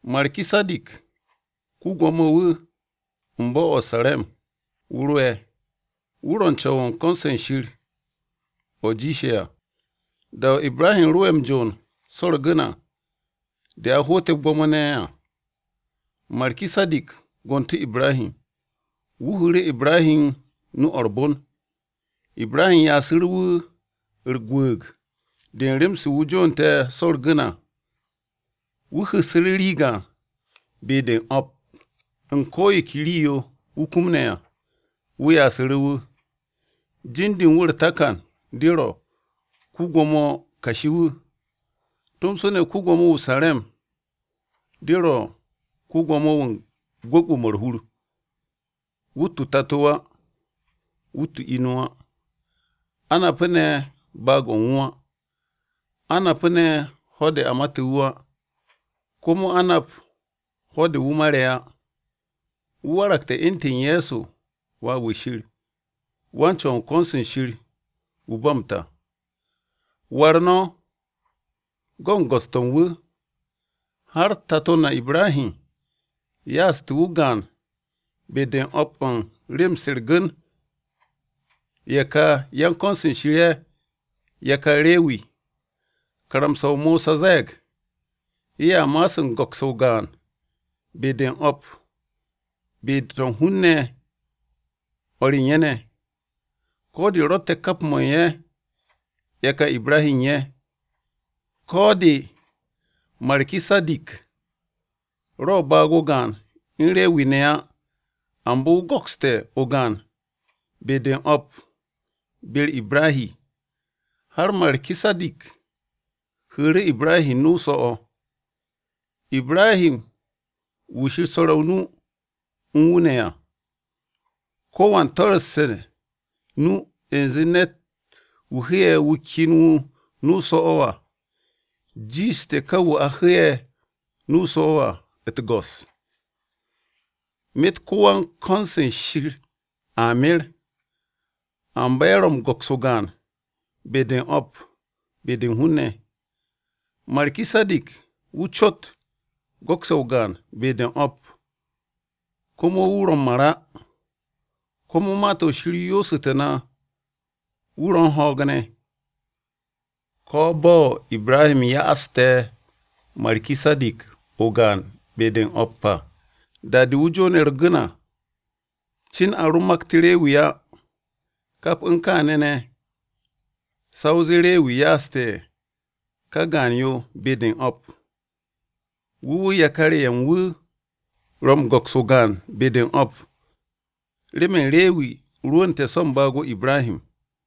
Markisadik ko-Gwo̱mo-wu̱ u̱n bo̱-o̱ o-Sare̱m wu̱ ro'e̱. Wu̱ ro̱ wan-Co̱w u̱n ko̱n-se Shir o̱ jiishe̱ à. Da-o̱ Ibrahi ro'e̱ m-jo'on so̱ u̱r-gu̱n à de a hoote̱ gwo̱mo-ne̱ à, Markisadik gontu̱ Ibrahi, wu̱ hu̱u̱ru̱ Ibrahi nu-o̱ u̱r-bon. Ibrahi ya'asu̱ru̱ wu̱ u̱r-gwu̱u̱g de u̱n rem-se wu̱ jo'onte̱ so̱ u̱r-gu̱n à. Wu̱ hu̱ssu̱ru̱ rii gaan be-de u̱n o̱p u̱n ko yo ke rii-yo wu̱ kumne̱ à, wu̱ ya'asu̱ru̱ wu̱. Jin-de u̱n wu̱ u̱r-takan de ro, “Ko-Gwo̱mo Kashi,” tomso ne̱ “Ko-Gwo̱mo-wu̱ o-Sare̱m,” de ro̱ “Ko-Gwo̱mo-wu̱ u̱n Gwu̱gwu̱-mo̱ u̱r-Hur.” Wu̱tt o-tato á. Wu̱tt o-inu á. A napu̱ ne̱ baag-o̱ u̱n wu̱ á. A napu̱ ne̱ ho̱-de a mate̱ wu̱ á. Komo a nap ho̱-de wu̱ mare̱ á. Wu̱ waragte̱ u̱ntu̱n Ye̱so Wà-wu̱ Shir, wan-Co̱w u̱n ko̱n-se Shir wu̱ u̱n ba m-ta. War no̱ go̱ u̱n go̱s-to̱ u̱n wu̱, har tato na Ibrahi ya'aste̱ wu̱ o-gaan be-de u̱n o̱p u̱n rem-se u̱r-gu̱n! Ye̱ kà yan-ko̱n-se Shir ye̱, yakar Rewi, karamsa-o Mosa ze̱e̱g ye̱a ma'as u̱n go̱ks o-gaan be-de u̱n o̱p be-to̱ u̱n hun-ne̱, o̱r u̱n ye̱ ne̱, ko̱ de̱ ro̱tte̱ kap mo̱ u̱n ye̱ yakar Ibrahi ye̱ à. Ko̱ de, Markisadik ro̱ baag-o̱ gaan u̱n Rewi ne̱ á, amba wu̱ go̱kste̱ o-gaan be-de o̱p be-u̱r Ibrahi, har Markisadik hu̱u̱ru̱ Ibrahi nu-o so̱-o̱, Ibrahi wu̱ Shir swo̱re̱ o-nu u̱n wu̱ ne̱ à. Ko̱wan toru̱sse̱ nu u̱nze ne̱t-wu̱ hu̱'e̱ wu̱ ken nu-o so̱-o̱ à, jiishte̱ ka wu̱ a hu̱'e̱ nu-o so̱-o̱ à u̱t-go̱s. Myet ko̱wan ko̱n-se Shir a mer, amba ye̱ ro̱ m-go̱ks o-gaan be-de u̱n o̱p be-de u̱n hun-ne̱, Markisadik wu̱ cot go̱kse̱ o-gaan be-de o̱p komo wu̱ ro̱ u̱n mar á. Komo Ma-to̱ Shir yoosu̱tu̱ na wu̱ ro̱ u̱n ho̱o̱g ne̱. Ko̱ bo̱ Ibrahi ya'aste̱ Markisadik o-gaan be-de u̱n o̱p à, da-de wu̱ jo'one̱ u̱r-gu̱n à, cin a ro makt Rewi á. Kap u̱n kaane̱ ne̱ sa o zee Rewi a ya'ase̱ ka gaan-yo be-de u̱n o̱p, wu̱ wu̱ yakar-ye̱ u̱n wu̱ ro̱ m-go̱ks o-gaan be-de u̱n o̱p, myet u̱n kaane̱ ne̱, Rewi ro̱ n-me̱ u̱n wu̱r-o Ibrahi ko-ya-n-ga-ye̱-wu̱ u̱n wu̱ da-o̱ Markisadik gonte̱ wu̱ à.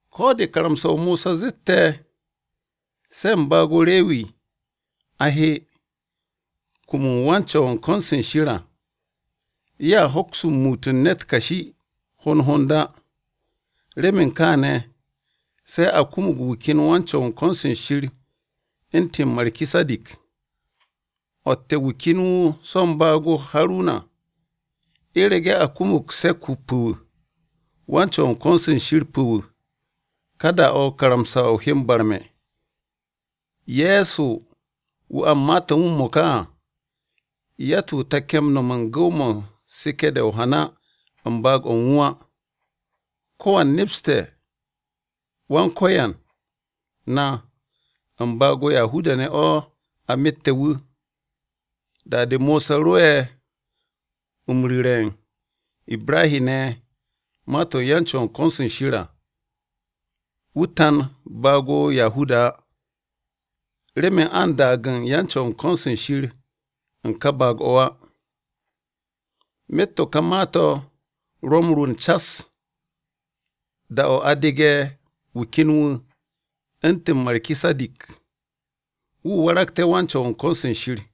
Ko̱ de karamsa-o Mosa zette̱ se̱ u̱n baag-o Rewi a he, kum u̱n wan-Co̱w u̱n ko̱n-se Shir à, ye̱a hoks muut u̱n ne̱t kashi hond hond á. Remen kaane̱ se̱ a kumug wu̱ ken wan-Co̱w u̱n ko̱n-se Shir wu̱ u̱ntu̱n Markisadik, o̱tte̱ wu̱ ken wu̱ so̱ u̱n baag-o Haruna. U̱rege̱ a kumug se̱k-wu̱ pu̱-wu̱ wan-Co̱w u̱n ko̱n-se Shir pu̱-wu̱, ka da-o̱ karamsa-o he m-barme̱. Ye̱so wu̱ a u̱n ma-to̱ u̱n wu̱ m-mo̱ka à, yatt-wu̱ take̱ nom u̱n gu̱w-mo̱ u̱n seke̱-de o-hana u̱n baag-o̱ u̱n wu̱ á. Ko̱wan nepste̱ Wan-Ko̱yan na u̱n baag-o Yahuda-ne̱ o̱ a mate̱ wu̱. Da-de Mosa ro'e̱ m-ru̱re̱ u̱n Ibra-ne̱ ma-to̱ u̱n yan-Co̱w u̱n ko̱n-se Shir à, wu̱ tan baag-o Yahuda á, remen a u̱n daag u̱n yan-Co̱w u̱n ko̱n-se Shir u̱n ka baag-o̱ á. Myet to̱ ka ma-to̱ ro̱ m-rwu̱u̱n cas, da-o̱ a dege̱ wu̱ ken wu̱ u̱ntu̱n Markisadik, wu̱ waragte̱ wan-Co̱w u̱n ko̱n-se Shir.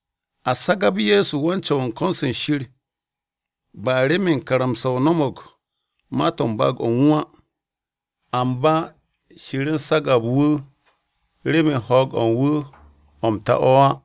A sagab Ye̱so wan-Co̱w u̱n ko̱n-se Shir ba remen karamsa-o no̱mo̱g ma-to̱ u̱n baag-o̱ u̱n wu̱ á, amba Shir u̱n sagab wu̱ remen ho̱o̱g-o̱ u̱n wu̱ o̱ m-ta o̱ á.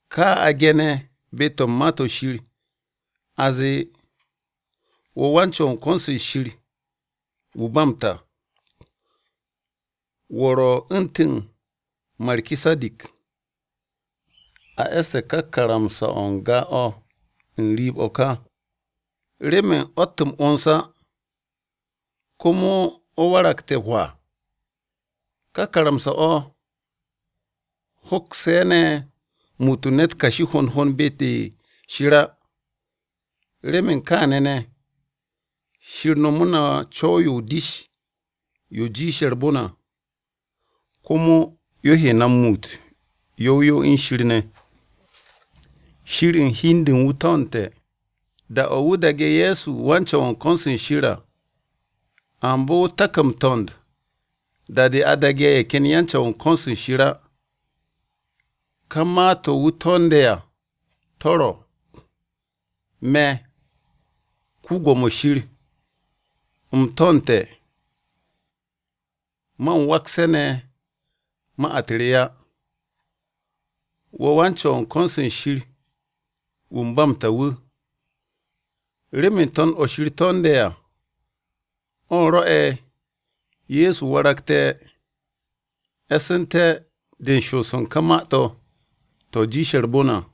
Kaa a ge̱ne̱ be-to̱ u̱n Ma-to̱ Shir, a zee, “Wo̱ wan-Co̱w u̱n ko̱n-se Shir wu̱ u̱n ba m-ta. Wo̱ ro̱ u̱ntu̱n Markisadik.” A e̱sste̱ ká karamsa-o̱ n-ga o̱ n-riib o̱ ka, remen o̱t m-'wo̱ns á, komo o̱ waragte̱ hwaa. Ká karamsa-o̱ hoksu̱ ne̱ muut u̱n ne̱t kashi hond hond be-de Shir á. Remen kaane̱ ne̱, Shir nomu̱ru̱ na co̱w-yo o-dish yo jiishe̱ u̱r-bon à, komo yo he na m-muut yow yow u̱n Shir ne̱. Shir u̱n hi-de u̱n wu̱ to̱ndte̱, da-o̱ wu̱ daage̱ Ye̱so wan-Co̱w u̱n ko̱n-se Shir à. Amba wu̱ tak m-to̱nd da-de a daage̱ ye̱ ken yan-Co̱w u̱n ko̱n-se Shir á. Ka ma-to̱ wu̱ to̱nde̱ à to̱ ro̱: “Me̱, Yawe, u̱m to̱ndte̱, man wakse̱ ne̱ ma-u̱t re á. ‘Wo̱ wan-Co̱w u̱n ko̱n-se Shir wu̱ u̱n ba m-ta wu̱.’” Remen to̱nd-o̱ Shir to̱nde̱ à, o̱ rwo̱'e̱ Ye̱so waragte̱ e̱su̱nte̱ de u̱n shoos u̱n ká ma-to̱, to̱ jiishe̱ u̱r-bon à.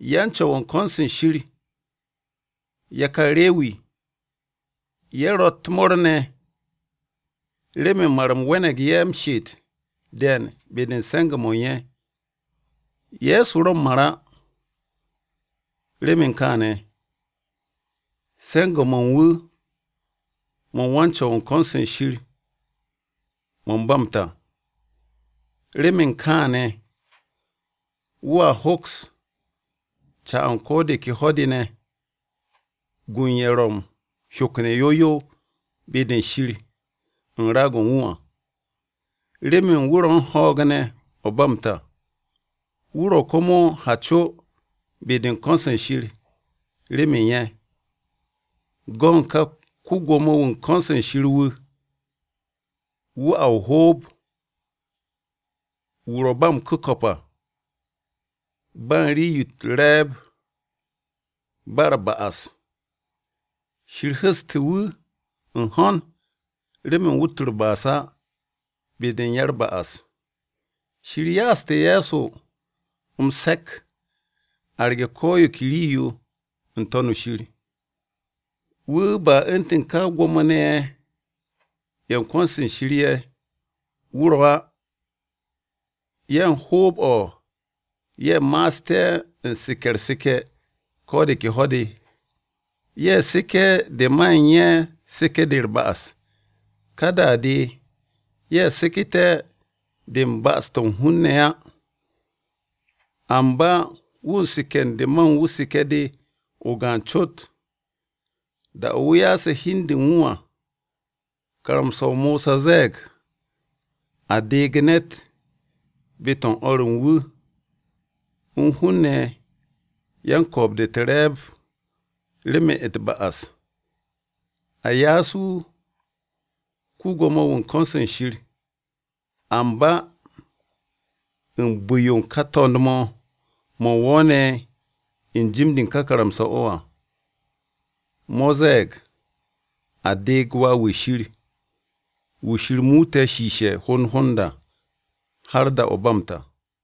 Yan-Co̱w u̱n ko̱n-se Shir, yakar Rewi, ye̱ ro̱ u̱t-mo̱o̱r ne̱ remen mar-m we̱ne̱g ye̱ m-she'et de̱e̱n be-de u̱n se̱nge̱-mo̱ u̱n ye̱. Ye̱so ro̱ m-mar á. Remen kaane̱, se̱nge̱-mo̱ u̱n wu̱ mo̱ u̱n wan-Co̱w u̱n ko̱n-se Shir mo̱ u̱n ba m-ta. Remen kaane̱, wu̱a hoks ca u̱n ko de ke ho̱-de ne̱, gu u̱n ye̱ ro̱ m-hyokne̱ yow yow be-de Shir u̱n raag-o̱ u̱n wu̱ à, remen wu̱ ro̱ u̱n ho̱o̱g ne̱ o̱ ba m-ta, wu̱ ro̱ komo m-ha co be-de u̱n ko̱n-se Shir remen ye̱. Go̱n ka ko-Gwo̱mo-wu̱ u̱n ko̱n-se Shir wu̱, wu̱ a m-ho̱o̱b, wu̱ ro̱ ba m-ku̱ko̱p à, ba u̱n rii-yo u̱t-re̱e̱b, ba u̱r-ba'as, Shir hu̱ste̱ wu̱ u̱n hon remen wu̱t u̱r-ba'as á be-de u̱n ya-u̱r-ba'as. Shir ya'aste̱ Ye̱so m-se̱k arge̱ ko yo ke rii-yo n-To̱n shir. Wu̱ ba u̱ntu̱n ka Gwo̱mo-ne̱ ye̱ u̱n ko̱n-se Shir ye̱, wu̱ ro̱ á. Ye̱ u̱n hoob-o̱, ye̱ ma'aste̱ u̱n seke̱ u̱r-seke̱ ko̱ de ke ho̱-de. Ye̱ seke̱ de ma u̱n ye̱ seke̱-de u̱r-ba'as de, ka da-de ye̱ seke̱te̱ de u̱n ba'as-to̱ u̱n hun-ne̱. Amba wu̱ u̱n seke̱ de ma u̱n wu̱ seke̱-de o-gaan cot, da-o̱ wu̱ ya'ase̱ hi u̱n de u̱n wu̱ à. Karamsa-o Mosa ze̱e̱g, a deeg ne̱t be-to̱ u̱n o̱r u̱n wu̱ u̱n hun-ne̱ yan-ko̱o̱b-de u̱r-be̱e̱b remen u̱t-ba'as. A ya'as wu̱ ko-Gwo̱mo-wu̱ u̱n ko̱n-se Shir. Amba u̱n bu̱-yo u̱n ka to̱nd-o̱, o̱ wo̱o̱ne̱ u̱n jim-de u̱n ka karamsa-o̱ à, o̱ ze̱e̱g a deeg Wà-wu̱ Shir, wu̱ Shir muute̱ shiishe̱ hond hond à, har da-o̱ ba m-ta.